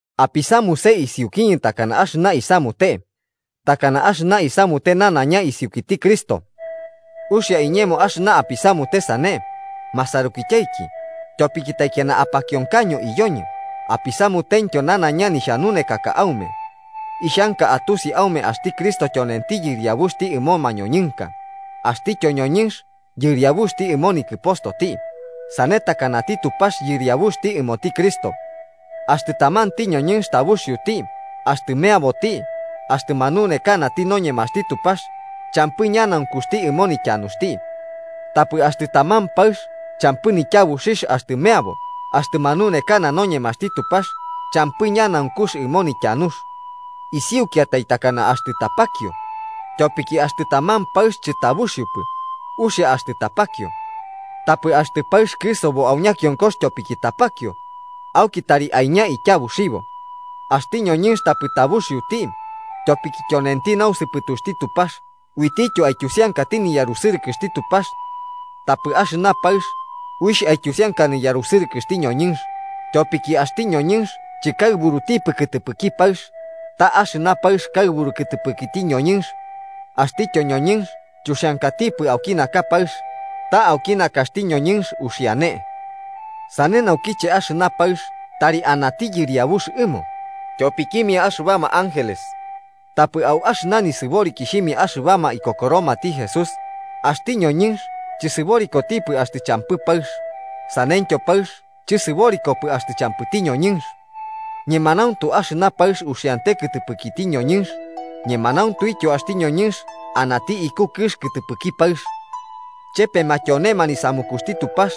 Apisamuse isiukiñɨ takana axɨna isamaute, takana axɨña isamute nanaiña isiukiti Cristo. Uxia iñemo axɨna apisamute sane, masarukityaiki, tyopiki taikiana apakionkaño iyoñɨ apisamutentyo nanaiña nixhanunekaka aume. Ixhanka atusi aume axti Cristo tyonenti yɨriabuxti ɨmo mañoñɨnka, axtityo ñoñɨnx yɨriabuxti ɨmo nikɨpostoti, sane takanati Tupax Yɨriabuxti ɨmoti Cristo. Axtɨ tamanti ñoñɨnx tabuxioti axtɨ meaboti axtɨ manunekanati noñemaxti Tupax champɨ ñanaunkuxti ɨmo nityanuxti. Tapɨ axtɨ taman paɨx, champɨ nityabuxixh axtɨ meabo axtɨ manunekana noñemaxti Tupax, champɨ ñanaunkux ɨmo nityanux. Isiukiatai takana axtɨ tapakio. Tyopiki axtɨ taman paɨx chɨtabuxiopɨ, uxia axtɨ tapakio. Tapɨ axtɨ paɨx kɨsobo au ñakionkox tyopiki tapakio, auki tari aiña tyabuxibo. Axti ñoñɨnx tapɨ tabuxioti, tyopiki tyonenti nausɨpɨtuxti Tupax uitityo aityusiankati niyarusɨrɨkɨxti Tupax. Tapɨ axɨna paɨx uixh aityusianka niyarusɨrɨkɨxti ñoñɨnx, tyopiki axti ñoñɨnx chɨkaɨburutipɨ kɨtɨpɨki paɨx, ta axɨna paɨx kaɨburu kɨtɨpɨkiti ñoñɨnx. Axtityo ñoñɨnx chuxiankatipɨ auki naka paɨx, ta auki nakaxti ñoñɨnx uxiane. Sane naukiche axɨna paɨx tari anati yɨriabux ɨmo, tyopikimia axɨbama ángeles. Tapɨ au axɨna nisɨborikixhimia axɨbama ikokoromati Jesús, axti ñoñɨnx chɨsɨborikotipɨ axtɨ champɨ paɨx, saneityo paɨx chɨsɨborikopɨ axtɨ champɨti ñoñɨnx. Ñemanauntu axɨna paɨx uxiante kɨtɨpɨkiti ñoñɨnx, ñemanauntuityo axti ñoñɨnx anati iku kɨx kɨtɨpɨki paɨx. Chepema tyonema nisamukuxti Tupax.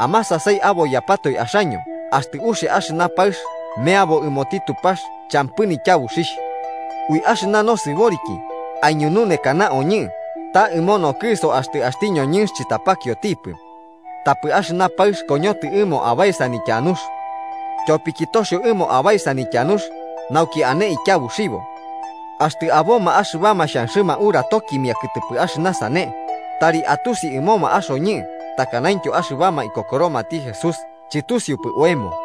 Amasasai aboiyapatoe axaño axtɨ uxia axɨna paɨx meabo ɨmoti Tupax champɨ nityabuxixh. Ui axɨna nosɨboriki aiñununekana oñɨ ta ɨmo nokɨso axtɨ axti ñoñɨnx chɨtapakiotipɨ. Tapɨ axɨna paɨx koñotɨ ɨmo abaesa nityanux. Tyopiki toxio ɨmo abaesa nityanux nauki ane tyabuxibo. Axtɨ aboma axɨbama xhanxɨma uratokimia kɨtɨpɨ axɨna sane, tari atusi ɨmoma axoñɨ takanaintyo axɨbama ikokoromati Jesús chɨtusiupɨ oemo.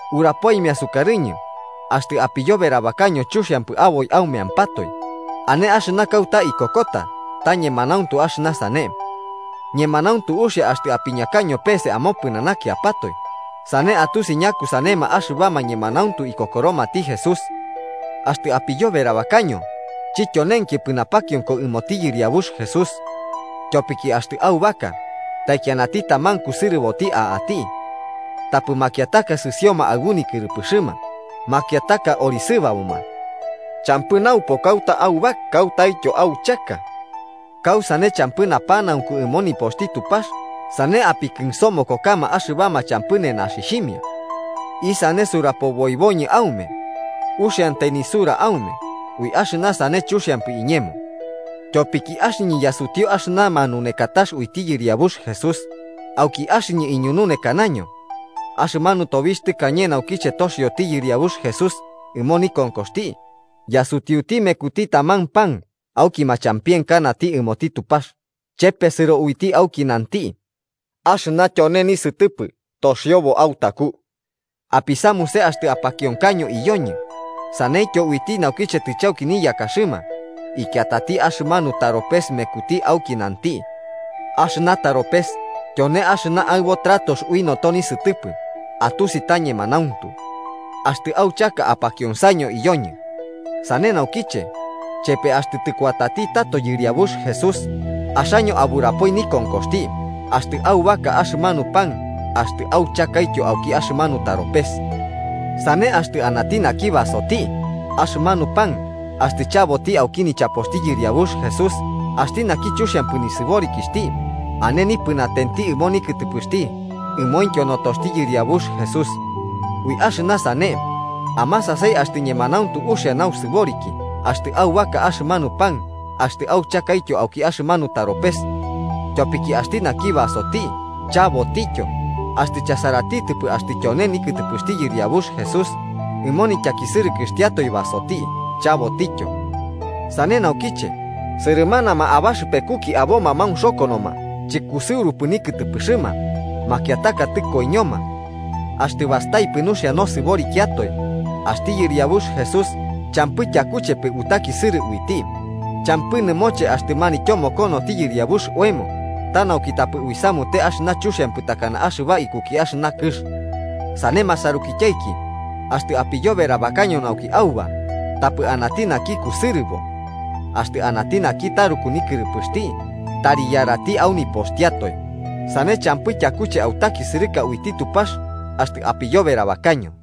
Urapoimia sukarɨñɨ, axtɨ apiyoberabakaño chuxiampɨ aboi aumeampatoe, ane axɨna kauta ikokota ta ñemanauntu axɨna sane. ¡Ñemanauntu uxia axtɨ apiñakaño pese amopɨnanakiapatoe, sane atusi ñakusanema axɨbama ñemanauntu ikokoromati Jesús! Axtɨ apiyoberabakaño, chityonenkipɨ napakionko ɨmoti Yɨriabux Jesús. Tyopiki axtɨ aubaka, taikianati taman kusɨrɨboti a'ati. Tapɨ makiataka sɨsioma aɨbu nikɨrɨpɨxɨma, makiataka orisɨbaboma. ¿Champɨ naupo kauta auba kautaityo auchaka? ¿Kausane champɨ napanaunku ɨmo nipoxti Tupax sane apikɨnsomokokama axɨbama champɨ nenaxixhimia? ¿Isane surapoboiboñɨ aume? ¿Uxiantai nisura aume? ¡Ui axɨna sane chuxiampɨ iñemo! Tyopiki axɨñɨ yasutiu axɨna manunekatax uiti Yɨriabux Jesús, auki axɨñɨ iñununekakaño: Axɨmanu tobixh tɨkañe naukiche toxioti Yɨriabux Jesús ɨmo nikonkoxti, yasutiuti mekuti taman pan auki machampienkanati ɨmoti Tupax, chepesɨro uiti auki nanti: “Axɨna tyone nisɨtɨpɨ toxiobo autaku. Apisamuse axtɨ apakionkaño iyoñɨ.” Saneityo uiti naukiche tɨchauki niyakaxɨma, ikiatati axɨmanu taropes mekuti auki nanti: “Axɨna taropes tyone axɨna aɨbo tratox ui noto nisɨtɨpɨ atusi ta ñemanauntu. Axtɨ auchaka apakionsaño iyoñɨ.” Sane naukiche, chepe axtɨ tɨkuati tato Yɨriabux Jesús, axaño aburapoi nikonkoxti axtɨ aubaka axɨmanu pan axtɨ auchakaityo auki axɨmanu taropes. Sane, axtɨ anati naki basoti axɨmanu pan axtɨ chabotityo auki nichapoxti Yɨriabux Jesús axti naki chuxiampɨ nisɨborikixhti, ane nipɨnatenti ɨmo nikɨtɨpɨxti ɨmointyo notoxti Yɨriabux Jesús. Ui axɨna sane, amasasai axtɨ ñemanauntu uxia nausɨboriki axtɨ aubaka axɨmanu pan axtɨ auchakaityo auki axɨmanu taropes. Tyopiki axti naki basoti chabotityo axtɨ chasaratitɨpɨ axtɨ tyone nikɨtɨpɨxti Yɨriabux Jesús, ɨmo nityakisɨrɨkɨxtiatoe basoti chabotityo. Sane naukiche, sɨrɨmanama abaxɨpekuki aboma maunxokonoma chɨkusɨurupɨ nikɨtɨpɨxɨma, makiataka tɨkoiñoma. Axtɨ bastaipɨ nuxia nosɨborikiatoe, axti yɨriabux Jesús champɨ tyakuchepɨ utakisɨrɨ uiti, champɨ nɨmoche axtɨ manityomokonoti Yɨriabux oemo ta nauki tapɨ uisamute axɨna chuxiampɨ takana axɨbama ikuki axɨna kɨx. Sane, masarukityaiki, axtɨ apiyoberabakaño nauki auba, tapɨ anati naki kusɨrɨbo. Axtɨ anati naki taruku nikɨrɨpɨxti, tari yarati au nipoxtiatoe, sane champɨ tyakuche autakisɨrɨka uiti Tupax axtɨ apiyoberabakaño.